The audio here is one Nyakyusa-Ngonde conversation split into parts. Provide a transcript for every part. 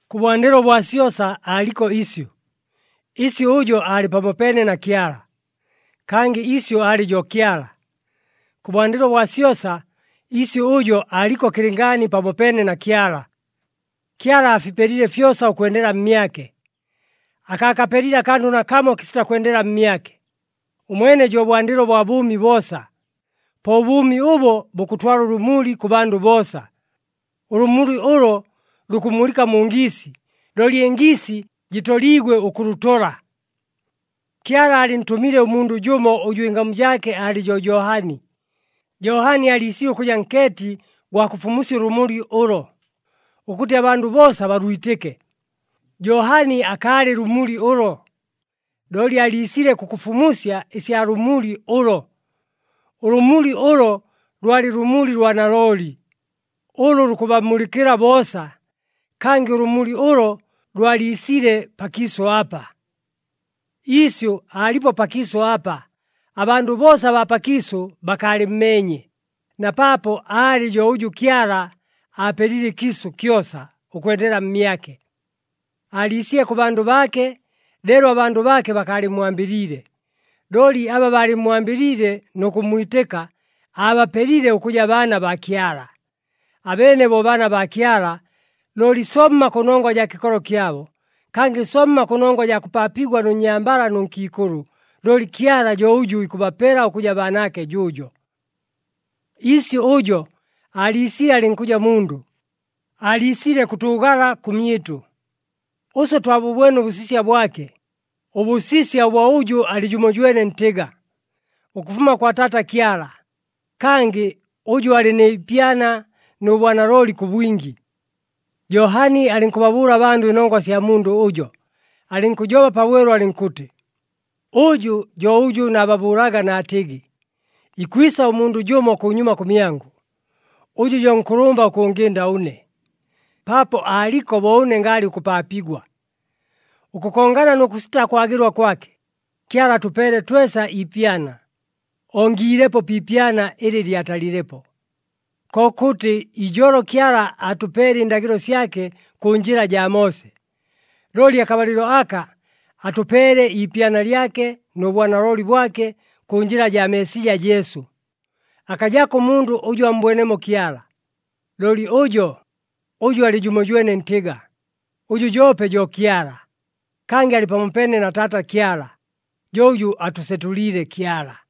Kʉbwandɨlo bwa syosa aaliko Isyʉ. Isyʉ ʉjo aalɨ pamopeene na Kyala. Kangɨ Isyʉ aalɨ jo Kyala. Kʉbwandɨlo bwa syosa, Isyʉ ʉjo aaliko kɨlɨngaani pamopeene na Kyala. Kyala aafipelile fyosa ʉkwendela mmyake. Akaakapelile akandʉ nakamo kɨsita kwendela mmyake. Ʉmwene jo bwandɨlo bwa bʉʉmi boosa. Po ʉbʉʉmi ʉbo bukʉtwala ʉlʉmuli kʉ bandʉ boosa. Ʉlʉmuli ʉlo lukʉmulɨka mu ngiisi, looli ɨngiisi jɨtoliigwe ʉkʉlʉtola. Kyala aalɨntʉmile ʉmundʉ jʉmo ʉjʉ ɨngamu jaake aalɨ jo Johani. Johani aaliisile ʉkʉja nkeeti gwa kʉfumusya ʉlʉmuli ʉlo, ʉkʉtɨ abandʉ boosa balwitɨke. Johani akaalɨ lʉmuli ʉlo, looli aaliisile kʉkʉfumusya ɨsya lʉmuli ʉlo. Ʉlʉmuli ʉlo lwalɨ lʉmuli lwa nalooli, ʉlʉ lukʉbamulɨkɨla boosa. Kangɨ ʉlʉmuli ʉlo lwaliisile pakiisʉ apa. Isyʉ aalipo pakiisʉ apa. Abandʉ boosa abaa pakiisʉ bakaalɨmmeenye, na paapo aalɨ jo ʉjʉ Kyala aapelile ɨkiisʉ kyosa ʉkwendela mmyake. Aaliisile kʉ bandʉ baake, leelo abandʉ baake bakaalɨmmwambɨliile. Looli aba baalɨmmwambɨliile nʉ kʉmmwitɨka, aabapelile ʉkʉja baana baa Kyala. Abeene bo baana baa Kyala, looli somma kʉnongwa jaa kɨkolo kyabo, kangɨ somma kʉnongwa jaa kʉpaapigwa nʉ nnyambala nʉ nkiikʉlʉ, looli Kyala jo ʉjʉ ikʉbapela ʉkʉja baanaake jʉʉjo. Isyʉ ʉjo aaliisile alɨnkʉja mundʉ, aaliisile kʉtʉʉgala kʉmyɨtʉ. Ʉswe twabʉbwene ʉbʉsisya bwake, ʉbʉsisya ʉbwa ʉjʉ alɨ jʉmojwene ntɨga, ʉkʉfuma kwa Taata Kyala, kangɨ ʉjʉ alɨ ni ipyana nʉ bwanalooli kʉ bwingi. Johani alɨnkʉbabʉʉla abandʉ ɨnongwa ɨsya mundʉ ʉjo, alɨnkʉjoba pabwelu alɨnkʉtɨ, “Ʉjʉ jo ʉjʉ naababʉʉlaga naatɨgɨ, ‘Ikwisa ʉmundʉ jʉmo kʉnyuma kʉmyangʉ, ʉjʉ jo nkʉlʉmba ʉkʉngɨnda ʉne, paapo aaliko bo ʉne ngaalɨ ʉkʉpaapigwa.’” Ʉkʉkongana nʉ kʉsita kwagɨlwa kwake, Kyala atʉpeele twesa iipyana, ongiilepo pi ipyana ɨlɨ lyatalilepo. Kokʉtɨ ijolo Kyala aatʉpeele ɨndagɨlo syake kʉ njɨla jaa Moose, looli akabalɨlo aka atʉpeele iipyana lyake nʉ bwanalooli bwake kʉ njɨla jaa Meesija Jesu. Akajako ʉmundʉ ʉjʉ ammbwenemo Kyala. Looli ʉjo, ʉjʉ alɨ jʉmojwene ntɨga, ʉjʉ joope jo Kyala, kangɨ alɨ pamopeene na Taata Kyala, jo ʉjʉ atʉsetʉliile Kyala.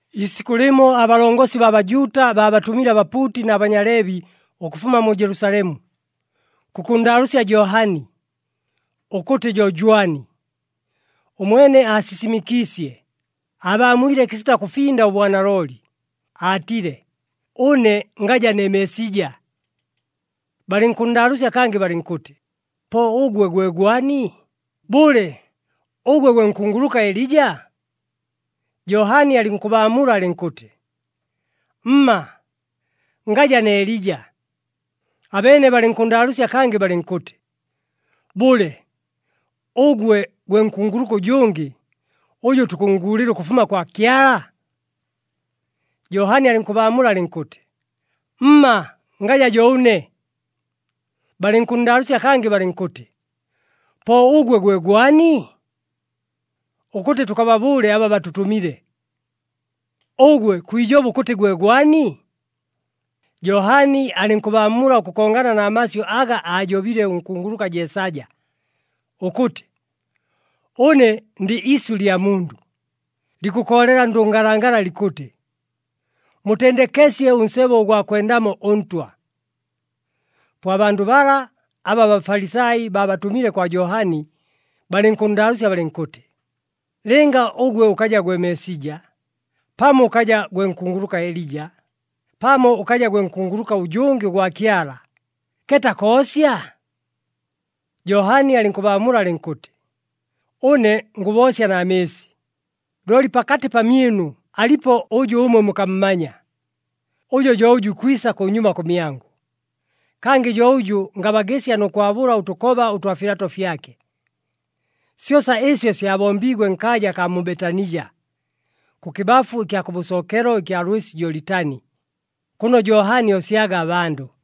Iisikʉ lɨmo abalongosi baa Bajuuta baabatʉmile abapuuti na Banyaleebi ʉkʉfuma mu Jelusalemu, kʉkʉnndaalʉʉsya Johani, ʉkʉtɨ jo jwani. Ʉmwene aasisimɨkiisye, aabaamwile kɨsita kʉfinda ʉbwanalooli, aatile, “Ʉne ngaja ne Meesija.” Balɨnkʉnndaalʉʉsya kangɨ balɨnkʉtɨ, “Po ʉgwe gwe gwani? Bʉle, ʉgwe gwe nkunguluka Elija?” Johani alɨnkʉbaamula alɨnkʉtɨ, “Mma, ngaja ne Elija.” Abeene balɨnkʉnndaalʉʉsya kangɨ balɨnkʉtɨ, “Bʉle, ʉgwe gwe nkunguluka ʉjʉngɨ, ʉjʉ tukʉnnguulɨla ʉkʉfuma kwa Kyala?” Johani alɨnkʉbaamula alɨnkʉtɨ, “Mma, ngaja jo ʉne.” Balɨnkʉnndaalʉʉsya kangɨ balɨnkʉtɨ, “Po ʉgwe gwe gwani? Ʉkʉtɨ tʉkababʉʉle aba batʉtʉmile. Ʉgwe kwijoba ʉkʉtɨ gwe gwani?” Johani alɨnkʉbaamula ʉkʉkongana na masyʉ aga aajobile ʉnkunguluka Jeesaja, ʉkʉtɨ, “Ʉne ndɨ isyʉ lya mundʉ, likʉkoolela ndʉngalangala likʉtɨ, ‘Mutendekesye ʉnsebo ʉgwa kwendamo ʉNtwa!’” Po abandʉ bala, aba aBafalisai baabatʉmile kwa Johani, balɨnkʉnndaalʉʉsya balɨnkʉtɨ, “Lɨnga ʉgwe ʉkaja gwe Meesija, pamo ʉkaja gwe nkunguluka Elija, pamo ʉkaja gwe nkunguluka ʉjʉngɨ ʉgwa Kyala, keeta koosya?” Johani alɨnkʉbaamula alɨnkʉtɨ, “Ʉne ngʉboosya na mɨɨsi, looli pakatɨ pamyɨnu alipo ʉjʉ ʉmwe mukammanya. Ʉjo jo ʉjʉ ikwisa kʉnyuma kʉmyangʉ, kangɨ jo ʉjʉ ngabagɨsya nʉ kwabʉla ʉtʉkoba ʉtwa filato fyake.” Syosa ɨsyo syabombiigwe nkaaja akaa mu Betanija, kʉkɨbafu ɨkya kʉbʉsookelo ɨkya lwɨsi Jolitani, kʉno Johani oosyaga abandʉ.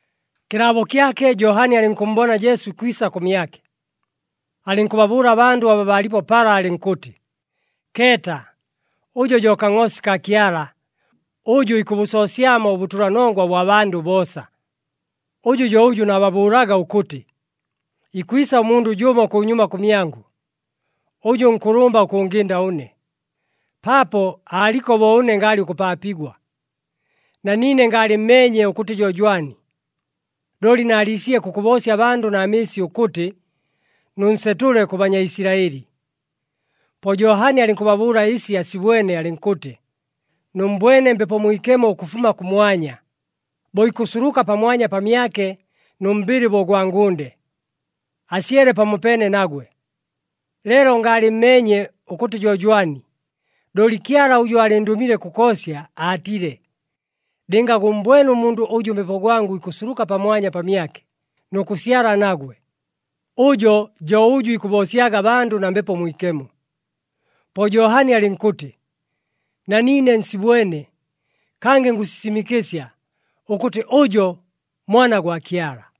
Kɨlaabo kyake, Johani alɨnkʉmmbona Jesu ikwisa kʉmyake. Alɨnkʉbabʉʉla abandʉ aba baalipo pala alɨnkʉtɨ, “Keeta, ʉjo jo Kangʼoosi kaa Kyala, ʉjʉ ikʉbʉsoosyamo ʉbʉtʉlanongwa bwa bandʉ boosa! Ʉjʉ jo ʉjʉ naababʉʉlaga ʉkʉtɨ, ‘Ikwisa ʉmundʉ jʉmo kʉnyuma kʉmyangʉ, ʉjʉ nkʉlʉmba ʉkʉngɨnda ʉne, paapo aaliko bo ʉne ngaalɨ ʉkʉpaapigwa.’ Na niine ngaalɨmmeenye ʉkʉtɨ jo jwani, looli naaliisile kʉkʉboosya abandʉ na mɨɨsi ʉkʉtɨ, nʉnsetʉle kʉ Banyaisilaɨli.” Po Johani alɨnkʉbabʉʉla ɨsi asibwene, alɨnkʉtɨ, “Nʉmmbwene Mbepo Mwikemo ʉkʉfuma kʉmwanya, bo ikʉsuluka pamwanya pamyake nʉ mbɨlɨ bo ʉgwa ngʉnde, asyele pamopeene nagwe. Leelo ngaalɨmmeenye ʉkʉtɨ jo jwani, looli Kyala ʉjʉ aalɨndʉmile kʉkoosya aatile, ‘Lɨnga gʉmmbwene ʉmundʉ ʉjʉ Mbepo gwangʉ ikʉsuluka pamwanya pamyake, nʉ kʉsyala nagwe, ʉjo jo ʉjʉ ikʉboosyaga abandʉ na Mbepo Mwikemo.’” Po Johani alɨnkʉtɨ, “Na niine nsibwene, kangɨ ngʉsisimɨkɨsya, ʉkʉtɨ ʉjo Mwana gwa Kyala.”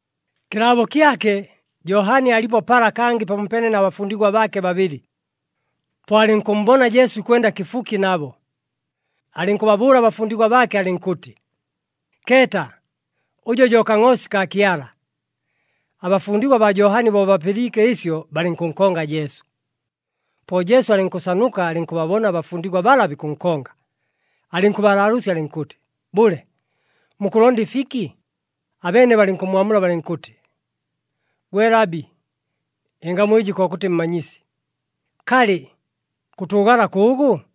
Kɨlaabo kyake, Johani aalipo pala kangɨ pamopeene na bafundigwa baake babɨlɨ. Po alɨnkʉmmbona Jesu ikwenda kɨfuki nabo. Alɨnkʉbabʉʉla abafundigwa baake alɨnkʉtɨ, “Keeta, ʉjo jo Kangʼoosi kaa Kyala!” Abafundigwa baa Johani bo bapɨliike ɨsyo, balɨnkʉnkonga Jesu. Po Jesu alɨnkʉsanuka, alɨnkʉbabona abafundigwa bala bikʉnkonga. Alɨnkʉbalaalʉʉsya alɨnkʉtɨ, “Bʉle, mukʉlonda ɨfiki?” Abeene balɨnkʉmmwamula balɨnkʉtɨ, “Gwe Labi (ɨngamu ɨjɨ kokʉtɨ Mmanyisi), kalɨ, kʉtʉʉgala kʉʉgʉ?”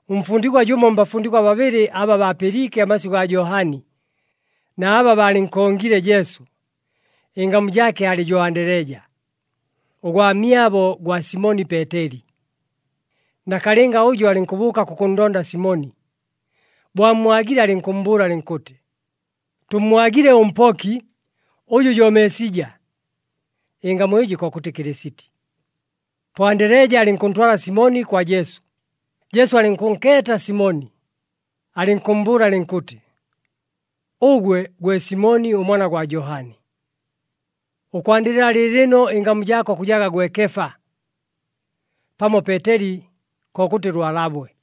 Ʉmfundigwa jʉmo mbafundigwa babɨlɨ aba baapɨliike amasyʉ gaa Johani, na aba baalɨnkongile Jesu, ɨngamu jaake aalɨ jo Andeleja, ʉgwamyabo gwa Simoni Peeteli. Nakalɨnga ʉjo alɨnkʉbʉʉka kʉkʉnndonda Simoni. Bo ammwagile, alɨnkʉmmbʉʉla alɨnkʉtɨ, “Tʉmmwagile ʉMpoki, ʉjʉ jo Meesija!” (Ɨngamu ɨjɨ kokʉtɨ Kɨlɨsiti.) Po Andeleja alɨnkʉntwala Simoni kwa Jesu. Jesu alɨnkʉnkeeta Simoni, alɨnkʉmmbʉʉla alɨnkʉtɨ, “Ʉgwe gwe Simoni ʉmwana gwa Johani. Ʉkwandɨla lɨɨlɨno, ɨngamu jaako kʉjaga gwe Kefa” (pamo Peeteli, kokʉtɨ Lwalabwe).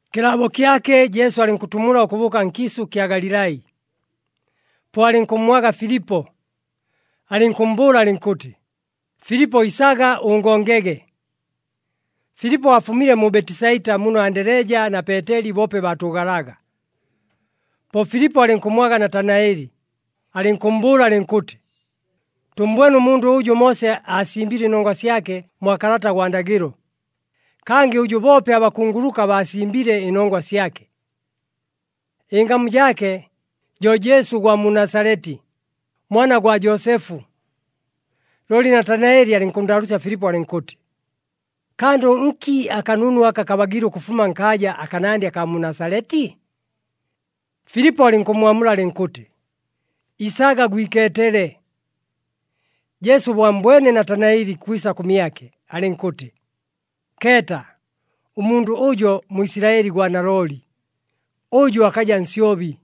Kɨlaabo kyake, Jesu alɨnkʉtumula ʉkʉbʉʉka nkiisʉ ɨkya Galilai. Po alɨnkʉmmwaga Filipo, alɨnkʉmmbʉʉla alɨnkʉtɨ, “Filipo, isaga ʉngongege.” Filipo aafumile mu Betisaita, muno Andeleja na Peeteli boope baatʉʉgalaga. Po Filipo alɨnkʉmmwaga Natanaeli, alɨnkʉmmbʉʉla alɨnkʉtɨ, “Tʉmmbwene ʉmundʉ ʉjʉ Moose aasimbile ɨnongwa syake mwa Kalata gwa Ndagɨlo, kangɨ ʉjʉ boope abakunguluka baasimbile ɨnongwa syake. Ɨngamu jaake jo Jesu ʉgwa mu Nasaleti, mwana gwa Joosefu.” Looli Natanaeli alɨnkʉnndaalʉʉsya Filipo alɨnkʉtɨ, “Kandʉ nki akanunu aka kabagiile ʉkʉfuma nkaaja akanandɨ akaa mu Nasaleti?” Filipo alɨnkʉmmwamula alɨnkʉtɨ, “Isaga gwikeetele.” Jesu bo ammbwene Natanaeli ikwisa kʉmyake, alɨnkʉtɨ, “Keeta, ʉmundʉ ʉjo Mwisilaɨli gwa nalooli, ʉjʉ akaja nsyobi.”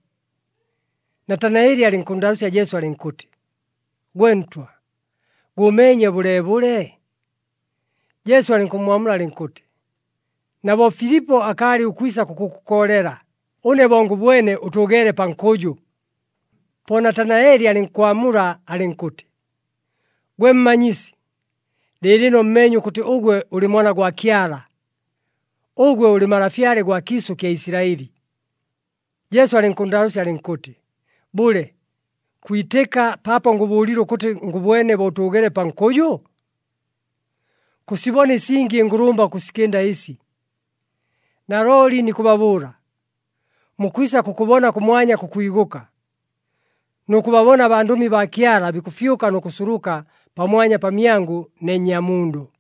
Natanaeli alɨnkʉnndaalʉʉsya Jesu alɨnkʉtɨ, “Gwe ntwa, gʉʉmeenye bʉleebʉle?” Jesu alɨnkʉmmwamula alɨnkʉtɨ, “Na bo Filipo akaalɨ ʉkwisa kʉkʉkoolela, ʉne bo ngʉbwene ʉtʉʉgeele pa nkʉjʉ.” Po Natanaeli alɨnkwamula alɨnkʉtɨ, “Gwe Mmanyisi, lɨɨlɨno mmeenye ʉkʉtɨ ʉgwe ʉlɨ Mwana gwa Kyala! Ʉgwe ʉlɨ Malafyale gwa kiisʉ kya Isilaɨli!” Jesu alɨnkʉnndaalʉʉsya alɨnkʉtɨ, “Bʉle, kwitɨka paapo ngʉbʉʉlile ʉkʉtɨ ngʉbwene bo ʉtʉʉgeele pa nkʉjʉ? Kʉsibona ɨsingi ɨngʉlʉmba ʉkʉsikɨnda ɨsi! Nalooli nikʉbabʉʉla, mukwisa kʉkʉbona kʉmwanya kʉkwigʉka, nʉ kʉbabona abandʉmi baa Kyala bikʉfyʉka nʉ kʉsuluka pamwanya pamyangʉ ne Nnyamundʉ.”